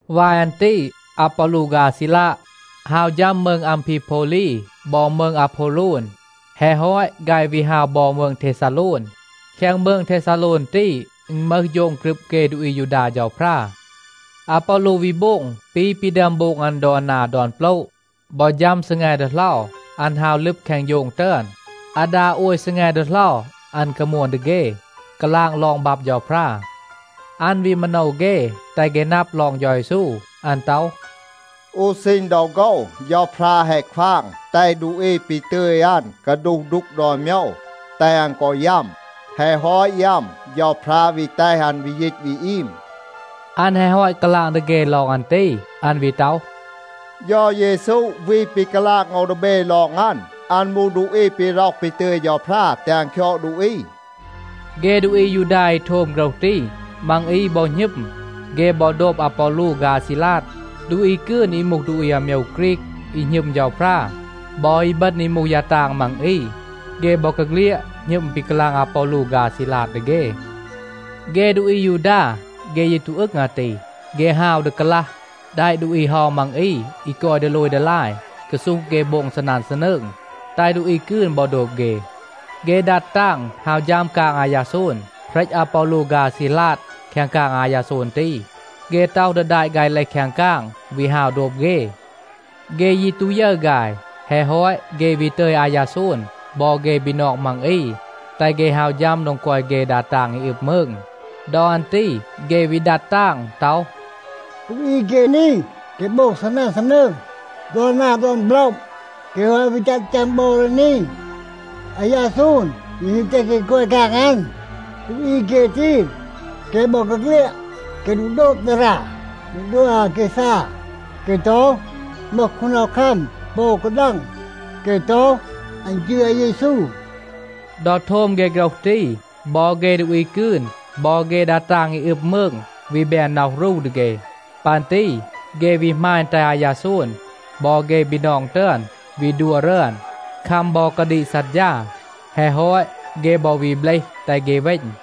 วาย อัน ตี. อาปอลู ฆาย อาซีลาด, ฮาว ฌัม มืง อัมพีโพวลี บอ มืง อาโพวโลน. แฮะ ฮอต, ฆาย วี ฮาว บอ มืง เทซาโลน. แคง มืง เทซาโลน ตี, อึณ มึห โฌง กรึบ เฆ ดูอี อายูดา เฌาพรา. อาปอลู วี โบง ปี ปี ดึอม โบง อัน ดอน นา ดอน โปละ. บอ ฌัม ซีแง ดีเหลา, อัน ฮาว ลึบ แคง โฌง ตึอน. อาดา โอย ซีแง ดีเหลา อัน กามวน ดี เฆ, กาลาง ลอง บับ เฌาพรา. อัน วี มาโนว เฆ, แตห เฆ นับ ลอง เฌา เยซู. อัน ต็อห, “อู ซีณ ดอ โฆว เฌาพรา แฮะ ควาง แตห ดูอี ปี ตึย อัน กาดูห ดูก ดอน โมยว, แตห อัน กอ ยัม. แฮะ ฮอต ยัม, เฌาพรา วี แตห อัน วี ยีต วี อีม.” อัน แฮะ ฮอต กาลาง ดี เฆ ลอง อัน ตี, อัน วี ต็อห, “เฌา เยซู วี ปี กาลาง โอว ดี เบ ลอง อัน, อัน มูห ดูอี ปี ร็อห ปี ตึย เฌาพรา แตห อัน คยอด ดูอี.” เฆ ดูอี อายูดา อี โทม โฆรห ตี, มัง อี บอ หณึม. เฆ บอ โดบ อาปอลู ฆาย อาซีลาด. ดูอี กืน อี มูห อาโมยว ฆรีก อี หณึม เฌาพรา, บอ อีบึณ อี มูห ยา ตาง มัง อี, เฆ บอกาเฆลียด หณึม ปี กาลาง อาปอลู ฆาย อาซีลาด ดี เฆ. เฆ ดูอี อายูดา, เฆ ยี ตู อึง อาตี. เฆ ฮาว ดี กาลัห, แดะ ดูอี เฮา มัง อี อี กอย ดีโลย ดีลาย กาซูห เฆ โบง ซีนัน ซีนืง, แตห ดูอี กืน บอ โดบ เฆ. เฆ ดัด ตาง ฮาว ฌัม กาง อายาโซน, เหรต อาปอลู ฆาย อาซีลาด แคง กาง อายาโซน ตี. เฆ ต็อห ดี แดะ ฆาย เลห แคง กาง, วี ฮาว โดบ เฆ. เฆ ยี ตู ยึร ฆาย. แฮะ ฮอต, เฆ วี ตึย อายาโซน บอ เฆ บีนอง มัง อี, แตห เฆ ฮาว ฌัม โดง กอย เฆ ดา ตาง อี อึบ มืง. ดอ อัน ตี เฆ วี ดัด ตาง ต็อห, “ดูอี เฆ นี, เฆ โบง ซีนัน ซีนืง ดอน นา ดอน โปละ. เฆ แฮะ วี ตัห ฌัม บอ ดี นี. อายาโซน ยี แฮะ แตห เฆ กอย แคง กาง อัน. ดูอี เฆ ตี, เฆ บอกาเฆลียด, เฆ ตู โดบ ดารา ปี ดัว อาแกซา. เฆ ต็อห, อึณ มึห คูนดีคัม ปอ อู กาดัง. เฆ ต็อห, อัน จืร อาเยซู.” ดอ โทม เฆ โฆรห ตี บอ เฆ ดูอี กืน บอ เฆ ดา ตาง อี อึบ มืง วี แบน น็อห รู ดี เฆ. ปัน ตี เฆ วี หมาณ แตห อายาโซน บอ เฆ บีนอง ตึอน วี ดัว รึอน, คัม บอ กาดีก ซัดฌา. แฮะ ฮอต เฆ บอ วี เบลห, แตห เฆ เวณ.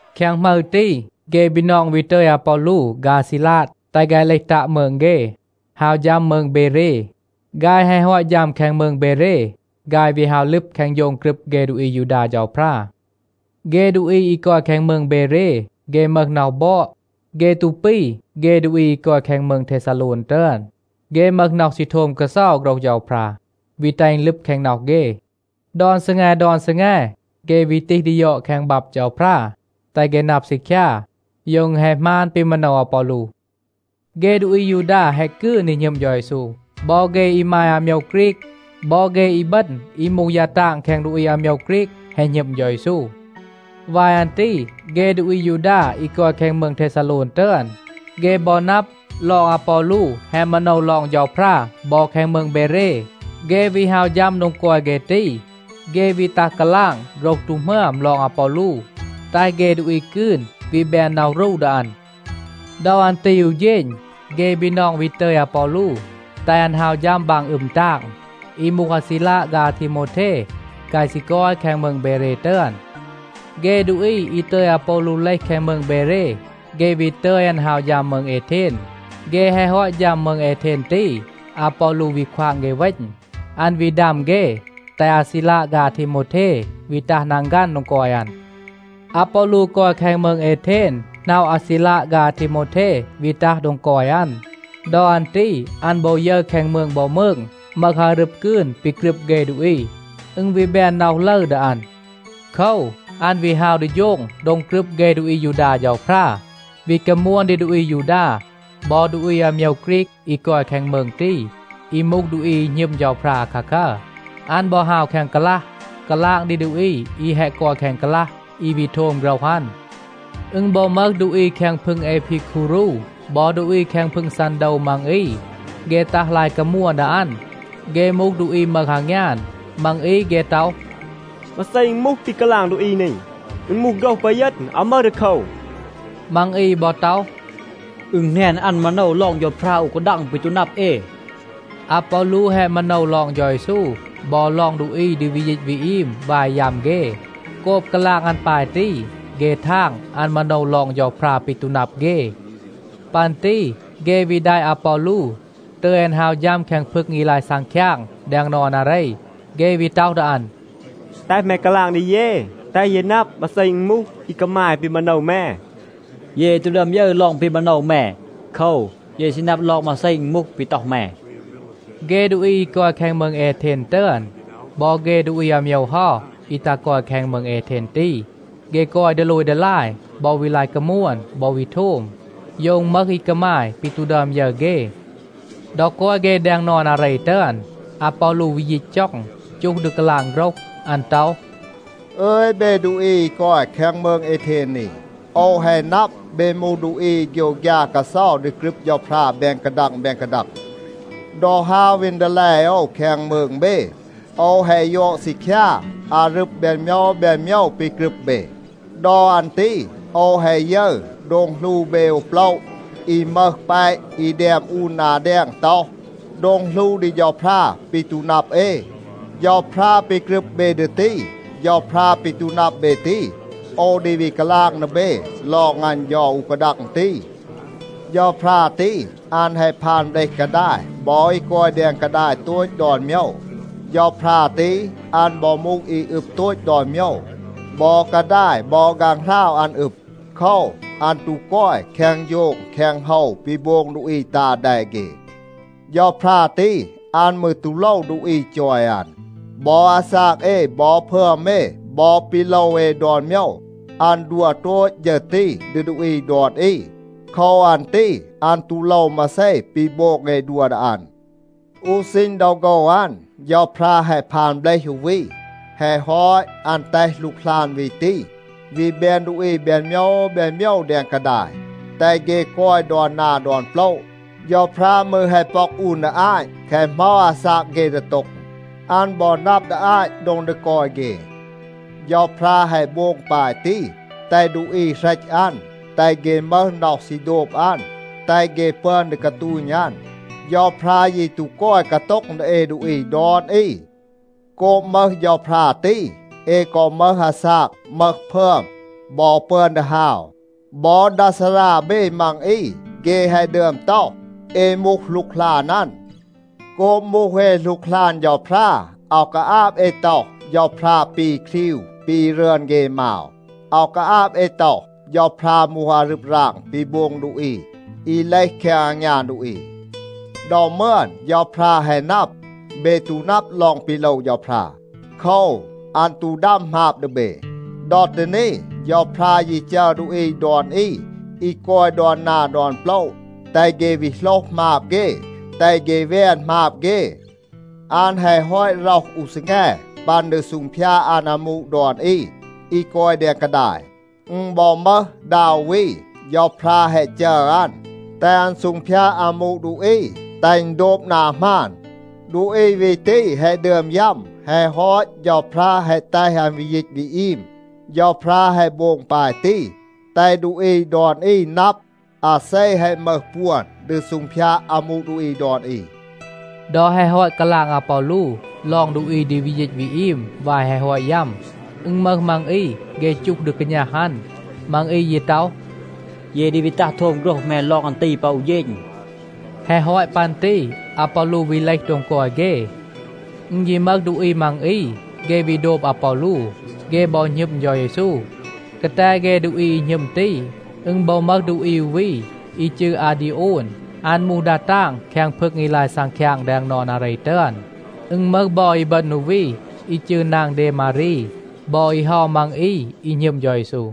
แคง หมึร ตี, เฆ บีนอง วี ตึย อาปอลู ฆาย อาซีลาด แตห ฆาย เลห ตัะ มืง เฆ, ฮาว ฌัม มืง เบเร. ฆาย แฮะ ฮอต ฌัม แคง มืง เบเร, ฆาย วี ฮาว ลึบ แคง โฌง กรึบ เฆ ดูอี อายูดา เฌาพรา. เฆ ดูอี อี กอย แคง มืง เบเร, เฆ มึห น็อห บอด. เฆ ตู ปี เฆ ดูอี อี กอย แคง มืง เทซาโลน ตึอน. เฆ มึห น็อห ซี โทม กาเซา โฆรห เฌาพรา, วี แตห อึณ ลึบ แคง น็อห เฆ. ดอน ซีแง ดอน ซีแง เฆ วี ตีห ดี ยอด แคง บับ เฌาพรา, แตห เฆ นับ ซีคยา, โยว อึณ แฮะ หมาน ปี มาโนว อาปอลู. เฆ ดูอี อายูดา แฮะ กืน อี หณึม เฌา เยซู. บอ เฆ อีมาย อาโมยว ฆรีก บอ เฆ อีบึณ อี มูห ยา ตาง แคง ดูอี อาโมยว ฆรีก แฮะ หณึม เฌา เยซู. วาย อัน ตี เฆ ดูอี อายูดา อี กอย แคง มืง เทซาโลน ตึอน, เฆ บอ นับ ลอง อาปอลู แฮะ มาโนว ลอง เฌาพรา บอ แคง มืง เบเร, เฆ วี ฮาว ฌัม โดง กอย เฆ ตี. เฆ วี ตัห กาลาง โฆรห ตู หมึอม ลอง อาปอลู, แตห เฆ ดูอี กืน วี แบน น็อห รู ดี อัน. ดอ อัน ตี อู เฌณ เฆ บีนอง วี ตึย อาปอลู, แตห อัน ฮาว ฌัม บาง อึม ตาง. อี มูห อาซีลาด ฆาย อาทีโมวเท, ฆาย ซี กอย แคง มืง เบเร ตึอน. เฆ ดูอี อี ตึย อาปอลู เลห แคง มืง เบเร, เฆ วี ตึย อัน ฮาว ฌัม มืง เอเทน. เฆ แฮะ ฮอต ฌัม มืง เอเทน ตี, อาปอลู วี ควาง เฆ เวณ. อัน วี ดัม เฆ, แตห อาซีลาด ฆาย อาทีโมวเท วี ตัห นังฆัน โดง กอย อัน. อาปอลู กอย แคง มืง เอเทน หน็อะ อาซีลาด ฆาย อาทีโมวเท วี ตัห โดง กอย อัน. ดอ อัน ตี อัน บอ ยึร แคง มืง บอ มืง มึห อารึบ กืน ปี กรึบ เฆ ดูอี. อึณ วี แบน น็อห ลึร ดี อัน. โคว, อัน วี ฮาว ดี โฌง โดง กรึบ เฆ ดูอี อายูดา เฌาพรา, วี กามวน ดี ดูอี อายูดา บอ ดูอี อาโมยว ฆรีก อี กอย แคง มืง ตี, อี มูห ดูอี อี หณึม เฌาพรา อาคาคัร. อัน บอ ฮาว แคง กาลัห, กาลาง ดี ดูอี อี แฮะ กอย แคง กาลัห, อี วี โทม โฆรห อัน. อึณ บอ มึห ดูอี แคง พึง เอพีคูรู บอ ดูอี แคง พึง ซันโดว มัง อี, เฆ ตัห ลาย กามวน ดี อัน. เฆ มูห ดูอี มึห อางยาน. มัง อี เฆ ต็อห, “มาเซ อึณ มูห, ปี กาลาง ดูอี นี. อึณ มูห โฆรห ปีเยณ, อาว มึห ดีโคว.” มัง อี บอ ต็อห, “อึณ แหนน อัน มาโนว ลอง เฌาพรา อู กาดัง ปี ตู นับ เอ.” อาปอลู แฮะ มาโนว ลอง เฌา เยซู บอ ลอง ดูอี ดี วี ยีต วี อีม วาย ยัม เฆ. โกบ กาลาง อัน ปาย ตี, เฆ ทาง, อัน มาโนว ลอง เฌาพรา ปี ตู นับ เฆ. ปัน ตี เฆ วี แดะ อาปอลู ตึย อัน ฮาว ฌัม แคง พึง อี ลาย ซังคยาง แดง นอน อาเร. เฆ วี ต็อห ดี อัน, “แตห แม กาลาง ดี เย, แตห เย นับ มาเซ อึณ มูห, อี กามาย ปี มาโนว แม. เย ตู ดึอม ยึร ลอง ปี มาโนว แม. โคว, เย ซี นับ ลอง มาเซ อึณ มูห, ปี ต็อห แม.” เฆ ดูอี อี กอย แคง มืง เอเทน ตึอน, บอ เฆ ดูอี อาโมยว เฮา อี ตัห กอย แคง มืง เอเทน ตี, เฆ กอย ดีโลย ดีลาย บอ วี ลาย กามวน บอ วี โทม, โยว อึณ มึห อี กามาย, ปี ตู ดึอม ยึร เฆ. ดอ กอย เฆ แดง นอน อาเร ตึอน, อาปอลู วี ยีต จ็อง, จูห ดี กาลาง โฆรห. อัน ต็อห, “อึย เบ ดูอี อี กอย มืง เอเทน นี. โอว แฮะ นับ, เบ มูห ดูอี อี โฆยวฆยา กาเซา ดี กรึบ เฌาพรา แบน กาดัง แบน กาดัง. ดอ ฮาว วีน ดีแล โอว แคง มืง เบ, โอว แฮะ ยอด ซีคยา อารึบ แบน โมยว แบน โมยว ปี กรึบ เบ. ดอ อัน ตี โอว แฮะ ยึร โดง หลู เบ อู โปละ อี มึห แปะ อี แดม อูน นา แดง ต็อห, ‘โดง หลู ดี เฌาพรา ปี ตู นับ เอ.’ เฌาพรา ปี กรึบ เบ ดี ตี, เฌาพรา ปี ตู นับ เบ ตี, โอว ดี วี กาลาง ดี เบ ลอง อัน เฌา อู กาดัง ตี. เฌาพรา ตี, อัน แฮะ พาน เบลห กาดาย บอ อี กอย แดง กาดาย โตต ดอน โมยว. เฌาพรา ตี, อัน บอ มูห อี อึบ โตต ดอน โมยว. บอ กาดาย บอ ฆางหราว อัน อึบ. โคว, อัน ตู กอย แคง โฌง แคง โฮว ปี โบง ดูอี ตา แด เฆ. เฌาพรา ตี, อัน มืร ตู โลว ดูอี จอย อัน. บอ อาซาก เอ บอ พึอม เอ, บอ ปี โลว เอ ดอน โมยว, อัน ดัว โตต ฌึร ตี ดี ดูอี ดอน อี. โคว อัน ตี อัน ตู โลว มาเซ ปี โบง เอ ดัว ดี อัน. อู ซีณ ดอ โฆว อัน, เฌาพรา แฮะ พาน เบลห อู วี. แฮะ ฮอต, อัน แตห หลูกหลาน วี ตี วี แบน ดูอี แบน โมยว แบน โมยว แดง กาดาย, แตห เฆ กอย ดอน นา ดอน โปละ. เฌาพรา มืร แฮะ ป็อก อูน ดี อาต, แคะ เหมา อาซาก เฆ ดี โต็ง. อัน บอ นับ ดี อาต โดง ดี กอย เฆ. เฌาพรา แฮะ โบง ปาย ตี, แตห ดูอี เหรต อัน, แตห เฆ มึห น็อห ซี โดบ อัน, แตห เฆ ปึอน ดี กาตูณ อัน. เฌาพรา ยี ตู กอย กาโต็ง ดี เอ ดูอี ดอน อี. โกบ มึห เฌาพรา ตี, เอ กอ มึห อาซาก, มึห พึอม บอ ปึอน ดี ฮาว. บอ ดา ซารา เบ มัง อี เฆ แฮะ ดึอม ต็อห, ‘เอ มูห หลูกหลาน อัน.’ โกบ มูห เอ หลูกหลาน เฌาพรา, อาว กาอาบ เอ ต็อห, เฌาพรา ปี ครีว, ปี รึอน เฆ มาว. อาว กาอาบ เอ ต็อห, เฌาพรา มูห อารึบ ราง ปี โบง ดูอี, อี เลห แคง อางยาน ดูอี. ดอ มึอน เฌาพรา แฮะ นับ, เบ ตู นับ ลอง ปี โลว เฌาพรา. โคว, อัน ตู ดัม หมาบ ดี เบ. ดอ ตี นี, เฌาพรา ยี จัร ดูอี ดอน อี, อี กอย ดอน นา ดอน โปละ, แตห เฆ วี โหลห หมาบ เฆ, แตห เฆ แวน หมาบ เฆ. อัน แฮะ ฮอต ร็อห อู ซีแง ปัน ดี ซูงพยาด อัน อามู ดอน อี, อี กอย แดง กาดาย. อึณ บอ มึห ดา อู วี, เฌาพรา แฮะ จัร อัน, แตห อัน ซูงพยาด อามู ดูอี, แตห อึณ โดบ นา หมาน. ดูอี วี ตี แฮะ ดึอม ยัม. แฮะ ฮอต, เฌาพรา แฮะ แตห อัน วี ยีต วี อีม. เฌาพรา แฮะ โบง ปาย ตี, แตห ดูอี ดอน อี นับ, อาเซ แฮะ มึห ปวน ดี ซูงพยาด อามู ดูอี ดอน อี.” ดอ แฮะ ฮอต กาลาง อาปอลู ลอง ดูอี ดี วี ยีต วี อีม วาย แฮะ ฮอต ยัม, อึณ มึห มัง อี, เฆ จูห ดี กาณัห อัน. มัง อี ยี ต็อห, “เย ดี วี ตัห โทม โฆรห แม ลอง อัน ตี ปอ อู เฌณ.” แฮะ ฮอต ปัน ตี อาปอลู วี เลห โดง กอย เฆ. อึณ ยี มึห ดูอี มัง อี, เฆ วี โดบ อาปอลู. เฆ บอ หณึม เฌา เยซู. กาแต เฆ ดูอี อี หณึม ตี, อึณ บอ มึห ดูอี อู วี อี จืร อาดีโอน. อัน มูห ดา ตาง แคง พึง อี ลาย ซังคยาง แดง นอน อาเร ตึอน. อึณ มึห บอ อีบึณ อู วี อี จืร นาง เดมารี, บอ อี เฮา มัง อี อี หณึม เฌา เยซู.